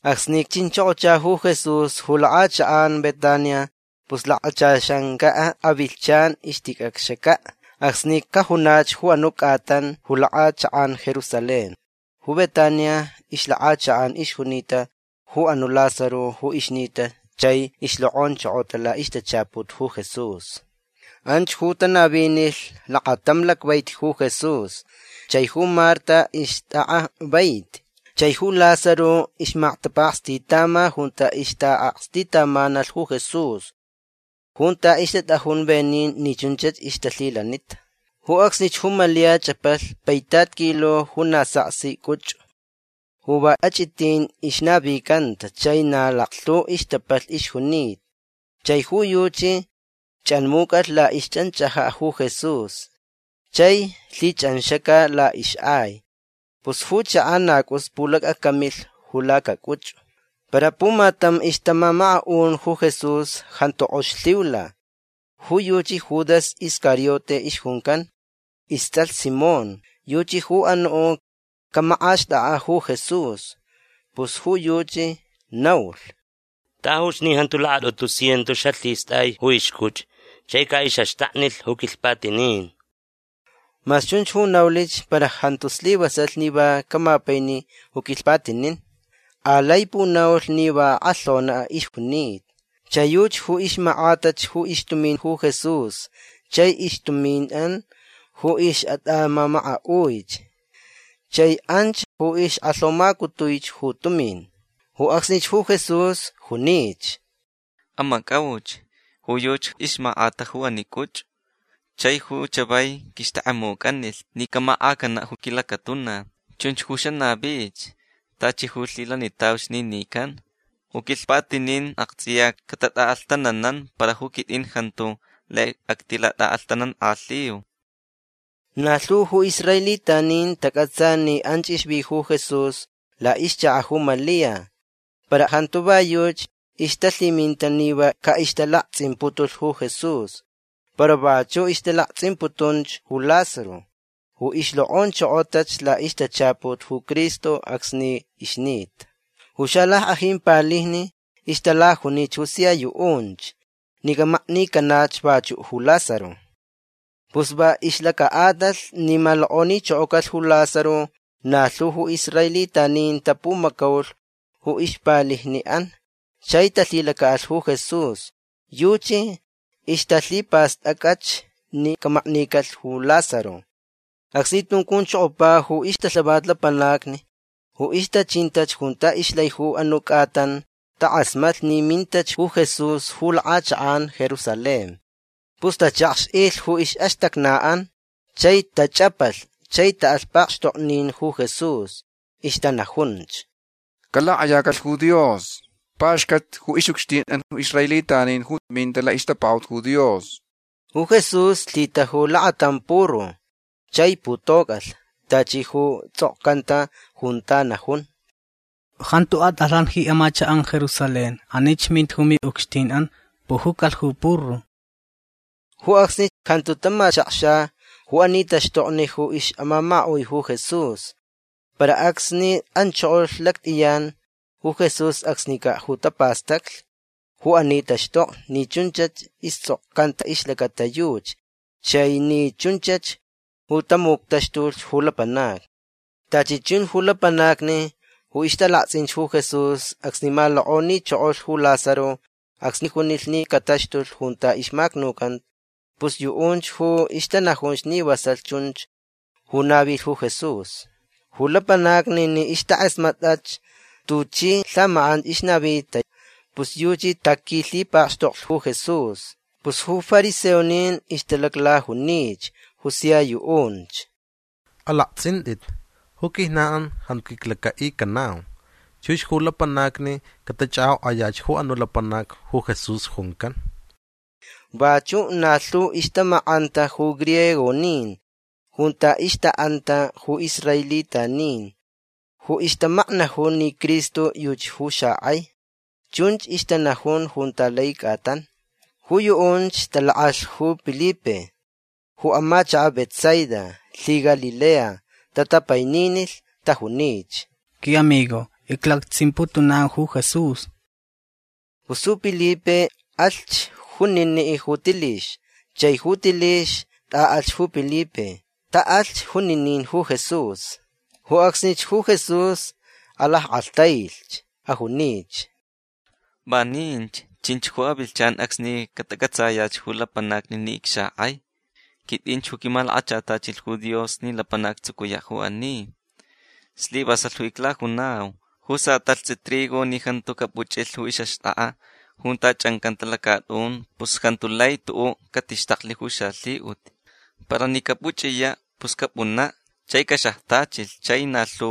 Acsni chinchokocha ju Jesús ju lakʼachakʼan Betania pus lakachaxancaʼ avilhchan ixticʼacxacaʼ acsni cajunach ju anuʼ cʼatan ju lakʼachakʼan Jerusalén. Ju Betania ixlakʼachakʼan ixjunita ju anuʼ Lázaro ju ixnita chai ixlokʼonchokota laʼixtachaput ju Jesús. Anch ju tanavinilh lakatam lacvaiti ju Jesús. Chai ju Marta ixtʼakʼa vaiti. Chai ju Lázaro ixmaktapakstitama junta ixtaʼakstitamanalh ju Jesús junta ixtatʼajun venin ni chunchach ixtalhilanita. Ju acsnich ju Malia chʼapalh paitat kilo ju na saksi cʼuchʼu ju va achʼitin ixnavicanta chai na laklhu ixtapalh ixjunita. Chai ju yuchi chʼanmucʼalh laʼixchʼanchʼajaʼ ju Jesús chai lhichʼanxaca laʼixʼai. Pus ju chakaʼ na cʼus pulacʼacamilh ju lacacʼuchʼu. Para pumatam ixtamamakaʼun ju Jesús jantu kʼox lhiula. Ju yuchi Judas Iscariote ixjuncan. Istsʼalh Simón. Yuchi ju anuʼ camakʼaxtʼakʼaʼ ju Jesús. Pus ju yuchi naulh: ―Tajuch ni jantu lakatʼutu cientos xalhistʼai ju ixcʼuchʼu chai caʼixʼaxtaknilh ju quilhpatinin. Mas chunch ju naulich para jantu slivasalh ni va camapaini ju quilhpatinin. Alai punaulh ni va akʼalhonaʼ ixjunita. Chai yuchi ju ixmakʼatach ju ixtumin ju Jesús chaich ixtuminʼan ju ixʼatʼamamakaʼuich. Chai anch ju ixkʼalhomacutuich ju tumin. Ju acsnich ju Jesús junich: ―Amacʼauch. Ju yuchi ixmakʼata ju ani cʼuchʼu. Chai ju chavai quixtʼekʼemucʼanilh ni camakʼacanaʼ ju quilacatuna. Chunch ju xanavich tachi ju lhilanitauch ni nican. Ju quilhpatinin aktsʼiya catatʼaʼalhtananan. Para ju quitʼin jantu lai actilatʼaʼalhtanankʼalhiu. Na lhu ju israelitanin tacʼatsa ni anch ixvi ju Jesús laʼixchakaʼ ju Malia. Para jantu va yuchi ixtalhiminta ni va caʼixtalaktsʼimputulh ju Jesús. Para vachuʼ ixtalaktsʼimputunch ju Lázaro ju ixlokʼonchokotach laʼixtachaput ju Cristo acsni ixnita. Ju xalackʼajin palijni ixtalajunich ju sia yuʼunch ni camaknicanach vachuʼ ju Lázaro. Pus va ixlacaʼatalh ni malokʼonichokocalh ju Lázaro na lhu ju israelitanin tapumacaulh ju ixpalijniʼan chai talhilacaʼalh ju Jesús. Yuchi ixtalhipastʼacʼach ni camaknicalh ju Lázaro. Acsni tuncunchokopa ju ixtalhavat lapanacni ju ixtachinta junta ixlai ju anuʼ cʼatan takʼasmatlh ni mintach ju Jesús ju lakʼachakʼan Jerusalén. Pus tachakxʼilh ju ixʼaxtacnaʼan chai tachʼapalhch chai taʼalh pakxtoknin ju Jesús. Ixtanajunch: ―Calakʼayacalh ju Dios. Paxcat ju ixʼucxtinʼan ju israelitanin ju minta laʼixtapakaʼut ju Dios. Ju Jesús lhitaju lakatam puru chai putocʼalh. Tachi ju tsʼokcanta junta najun: Jantu atʼalhan ji amachakʼan Jerusalén. Anich minta ju miʼucxtinʼan. Pujucalh ju puru. Ju acsni jantu tamachakxa ju ani taxtokni ju ixʼamamakaʼui ju Jesús. Para acsni anchokolh lactʼiyan ju Jesús acsnicaʼ ju tapastaclh ju ani taxtokni ni chunchach istsʼokcanta ixlacata yuchi chai ni chunchach ju tamuctaxtulh ju lapanacni. Tachi chun ju lapanacni ju ixtalaktsʼinch ju Jesús acsni malokʼonichokolh ju Lázaro acsni junilh ni cataxtulh junta ixmacnucanta pus yuʼunch ju ixtanajunch ni vasalh chunch ju navilh ju Jesús. Ju lapanacni ni ixtakʼasmatʼach tuchi lhamakʼan ixnavita pus yuchi taquilhipakxtoklh ju Jesús. Pus ju fariseonin ixtalaclajunich ju sia yuʼunch: ―Alaktsʼintʼit. Ju quijnanʼan jantu quiclacaʼicanau. Chux ju lapanacni catachʼakʼokʼayach ju anuʼ lapanac ju Jesús juncan. Vachu na lhu ixtamakʼanta ju griegonin junta ixtaʼanta ju israelitanin ju ixtamaknajun ni Cristo yuchi ju xakʼai. Chunch ixtanajun junta lai cʼatan. Ju yuʼunch talakʼalh ju Pilipe ju amachakaʼ Betsaida lhiGalilea. Tatapaininilh. Tajunich: ―Quiʼamigo. Iclaktsʼimputunau ju Jesús. Pus ju Pilipe alhch juniniʼ ju Tilix. Chai ju Tilix tʼaʼalhch ju Pilipe. Taʼalhch juninin ju Jesús. Ju acsnich ju Jesús alackʼalhtailh. Ajunich: ―Vaninch chinch ju avilhchan acsni catacʼatsayach ju lapanacni ni icxakʼai. Quitʼinch ju quimalakachatachilh ju Dios ni lapanac actsucuyaʼ ju ani. Slivasalh ju iclajunau. Ju satalhtsʼi trigo ni jantu capuchʼilh ju ixʼaxtʼakʼa junta chʼancanta lacatʼun pus jantu lai tuʼuʼ catixtaklh ju xalhiʼut. Para ni capuchʼiyaʼ pus capʼunaʼ chai caxajtachilh chai na lhu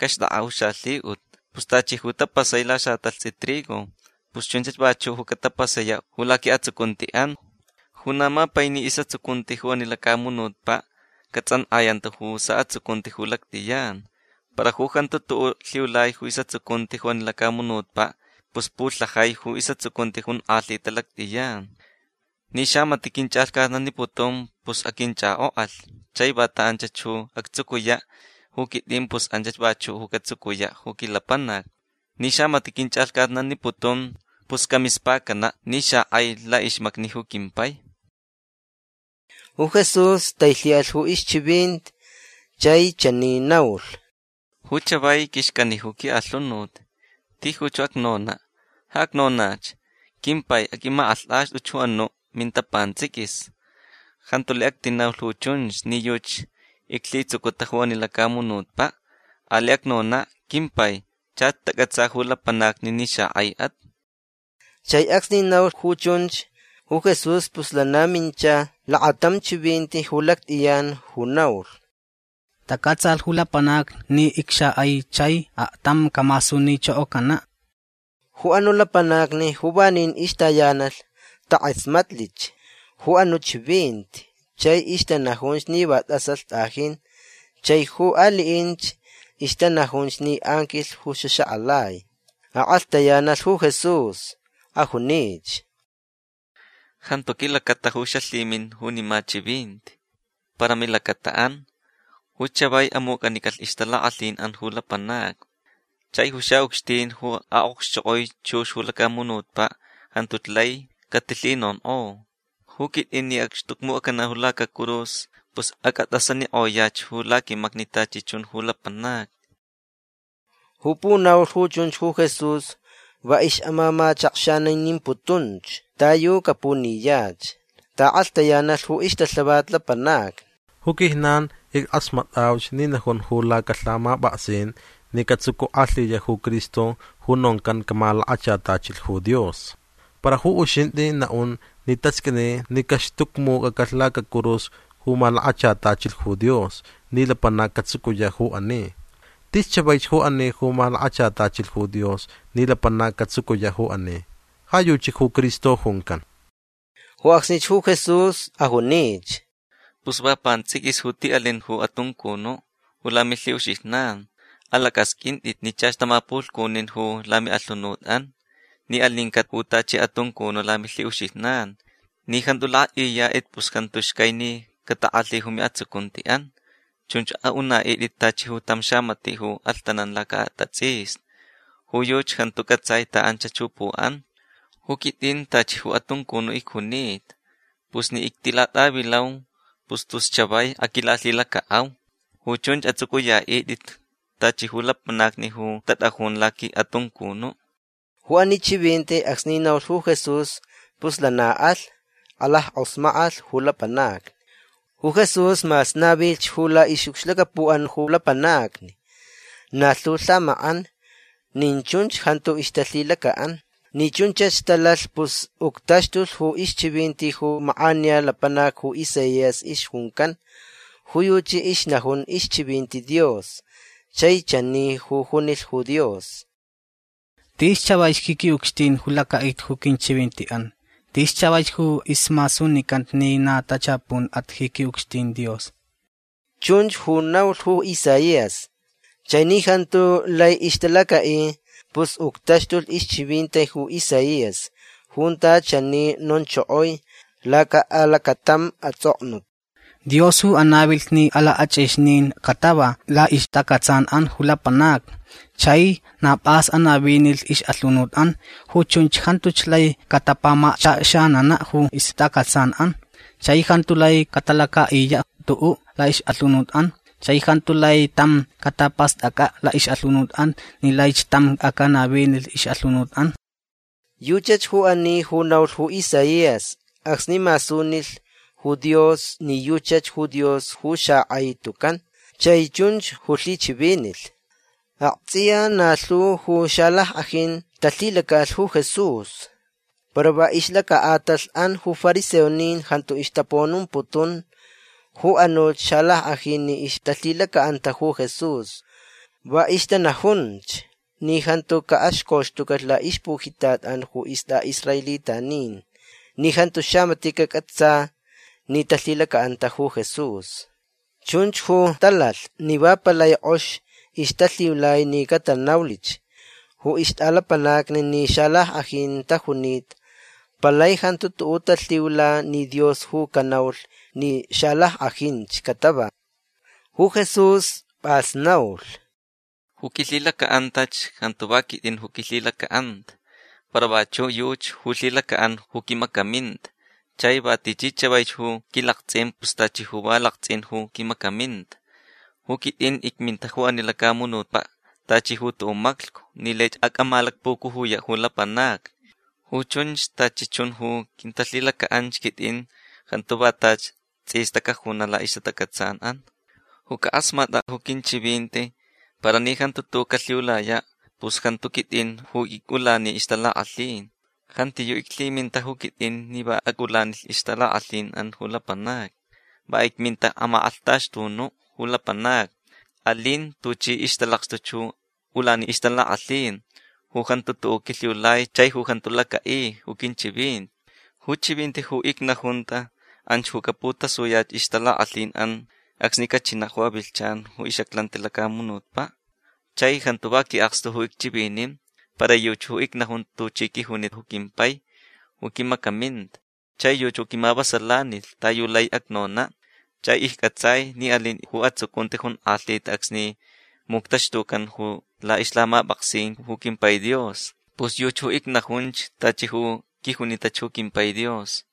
caxtʼakʼaʼ ju xalhiʼut. Pus tachi ju tapasai lasatalhtsʼi trigo pus chunchach vachuʼ ju catapasayaʼ ju laquiʼatsucuntiʼan. Ju na mapaini isʼatsucunti ju ani lacamunutpaʼ catsʼankʼayanta ju saʼatsucunti ju lactʼiyan. Para ju jantu tuʼuʼ lhiulai ju isʼatsucunti ju ani lacamunutpaʼ pus pulhajai ju isʼatsucunti jonkʼalhita lactʼiyan. Ni xamatiʼ quinchʼalhcatnaniputun pus aquinchʼakʼokʼalh. Chai vanta anchach ju actsucuyaʼ ju quitʼin pus anchach vachuʼ catsucuyaʼ ju quilapanac. Ni xamatiʼ quinchʼalhcatnaniputun pus camispacanaʼ ni xakʼai laʼixmacni ju quimpai. Ju Jesús tailhiʼalh ju ixchivinti chai chani naulh: ―Ju chavai quixcani ju quiʼalhunut. Tijuch ju acnonaʼ. Ja acnonach: “Quimpai aquimakʼalhtʼaxtʼuch ju anuʼ minta pantsʼiquis”. Jantu lai actinaulh ju chunch ni yuchi iclhitsucuta ju ani lacamunutpaʼ. Alai acnonaʼ: “Quimpai chach tacʼatsa ju lapanacni ni xakʼaichʼat”. Chai acsni naulh ju chunch ju Jesús pus lana mincha lakatam chivinti ju lactʼiyan ju naulh: ―Tacʼatsalh ju lapanacni ni icxakʼai chai aktam camasunichokocanaʼ. Ju anuʼ lapanacni ju vanin ixtayanalh takʼasmatlich ju anuʼ chivinti. Chai ixtanajunch ni va tʼasalh tʼajin. Chai ju aliʼinch ixtanajunch ni anquilh ju xaxakʼalai. Akʼalhtayanalh ju Jesús. Ajunich: ―Jantu quilacata ju xalhimin junima chivinti. Para milacataʼan. Ju chavai amucʼanicalhch ixtalakʼalhinʼan ju lapanacni. Chai ju xaʼucxtin ju aʼokxchokʼoi chux ju lacamunutpaʼ jantuch lai catilhinonkʼo. Ju quitʼin ni acxtucmucʼacanaʼ ju lacacurus pus acʼatʼasanikʼoyach ju laquimacni tachi chun ju lapanacni. Ju punaulich ju chunch ju Jesús va ixʼamamachakxaninimputunch ta yu capuniyach. Taʼakʼalhtayanalh ju ixtalhavat lapanacni: ―Ju quijnan ickʼasmatʼauch ni najun ju lacalhamapʼaksin ni catsucukʼalhiyaʼ ju Cristo ju noncan camalakachatachilh ju Dios. Para ju uxintʼi naʼun ni tasqʼuini ni caxtucmucʼacalh lacacurus ju malakachatachilh ju Dios ni lapanac catsucuyaʼ ju ani. Tis chavaich ju ani ju malakachatachilh ju Dios ni lapanac catsucuyaʼ ju ani. Ja yuchi ju Cristo juncan. Ju acsnich ju Jesús ajunich: ―Pus va pantsʼiquisch ju tiʼalin ju atuncunuʼ ju lamilhiʼuxijnan. Alacʼasqʼuintʼit ni chach tamapulhcunin ju lamiʼalhunutʼan ni alincaʼ ju tachi atuncunuʼ lamilhiʼuxijnan. Ni jantu lakʼaʼiyatʼit pus jantu xcai ni catakʼalhi ju miʼatsucuntiʼan. Chunch aʼunaʼitʼit tachi tam xamatiʼ ju alhtanan lacaʼatatsʼisni. Ju yuchi jantu cʼatsai taʼanchach ju puʼan. Ju quitʼin tachi ju atuncunuʼ icjunita. Pus ni ictilatʼavilau pus tus chavai aquilalhilacaʼau. Ju chunch atsʼucʼuyaʼitʼit tachi ju lapanacni ju tatʼajun laquiʼatuncunuʼ. Ju ani chivinti acsni naulh ju Jesús pus lana alh. Alackʼosmakʼalh ju lapanacni. Ju Jesús mas navilhch ju laʼixʼucxlacapuʼan ju lapanacni na lhu lhamakʼan nin chunch jantu ixtalhilacaʼan. Ni chunchach talalh pus uctaxtulh ju ixchivinti ju makʼaniya lapanac ju Isaías ixjuncan. Ju yuchi ixnajun ixchivinti Dios chai chani ju junilh ju Dios: Tis chavaich ji quiʼucxtin ju lacaʼita ju quinchivintiʼan. Tis chavaich ju ismasunicanta ni na tachapunʼat ji quiʼucxtin Dios. Chunch ju naulh ju Isaías. Chai ni jantu lai ixtalacaʼi pus uctaxtulh ixchivinti ju Isaías junta chani nonchokoi lacaʼalacatam atsʼoknut: Dios ju anavilh ni alakʼachʼixnin catava laʼixtacʼatsanʼan ju lapanacni. Chai na pʼas anavinilh ixʼalhunutʼan. Ju chunch jantuch lai catapamachakxananaʼ ju ixtacʼatsanʼan. Chai jantu lai catalacaʼiyaʼ tuʼuʼ laʼixʼalhunutʼan. Chai jantu lai tam catapastʼacʼaʼ laʼixʼalhunutʼan ni laich tam acʼanavinilh ixʼalhunutʼan. Yuchach ju ani ju naulh ju Isaías acsni masunilh ju Dios ni yuchach ju Dios ju xakʼai tucan. Chai chunch ju lhichivinilh. Aktsʼiya na lhu ju xalackʼajin talhilacaʼalh ju Jesús. Para va ixlacaʼatalhʼan ju fariseonin jantu ixtapunomputun ju anuch xalackʼajin ni ixtalhilacaʼanta ju Jesús. Va ixtanajunch ni jantu caʼaxcoxtucalh laʼixpujitatʼan ju istʼaʼisraelitanin ni jantu xamatiʼ cacʼatsa ni talhilacaʼanta ju Jesús. Chunch ju talalh ni va palai kʼox ixtalhiulai ni catanaulhch ju ixtʼalapanacni ni xalackʼajin tajunita. Palai jantu tuʼuʼ talhiula ni Dios ju canaulh ni xalackʼajinch catava. Ju Jesús pʼas naulh: ―Ju quilhilacaʼantach jantu va quitʼin ju quilhilacaʼanta. Para vachuʼ yuchi ju lhilacaʼan ju quimacaminta. Chai va tichi chavaich ju quilaktsʼin pus tachi ju va laktsʼin ju quimacaminta. Ju quitʼin icminta ju ani lacamunutpaʼ tachi ju tuʼuʼ maclhcu ni laich acʼamalacpucujuyaʼ ju lapanacni. Ju chunch tachi chun ju quintalhilacaʼanch quitʼin jantu va tachi tsʼista cajunaʼ ju laʼixtacʼatsanʼan. Ju cakʼasmatʼaʼ ju quinchivinti para ni jantu tuʼuʼ calhiulayaʼ pus jantu quitʼin ju icʼulani ixtalakʼalhin. Jantiyuʼ iclhiminta ju quitʼin ni va acʼaʼulanilh ixtalakʼalhinʼan ju lapanacni. Va icminta amakʼalhtaxtunuʼ ju lapanacni. Alin tuchi ixtalakxtuch ju ulani ixtalakʼalhin ju jantu tuʼuʼ quilhiulai chai ju jantu lacaʼi ju quinchivinti. Ju chivinti ju icnajunta anch ju caputasuyach ixtalakʼalhinʼan acsni cachinaʼ ju avilhchan ju ixʼaclanti lacamunutpaʼ. Chai jantu va quiʼakstu ju icchivinin. Para yuchi ju icnajun tuchi quijuni ju quimpai ju quimacaminta. Chai yuchi ju quimavasalanilh ta yu laich acnonaʼ. Chai iccʼatsaich ni alin ju atsucunti jonkʼalhita acsni muctaxtucan ju laʼixlhamapʼaksin ju quimpai Dios. Pus yuchi ju icnajunch tachi ju quijunitach ju quimpai Dios.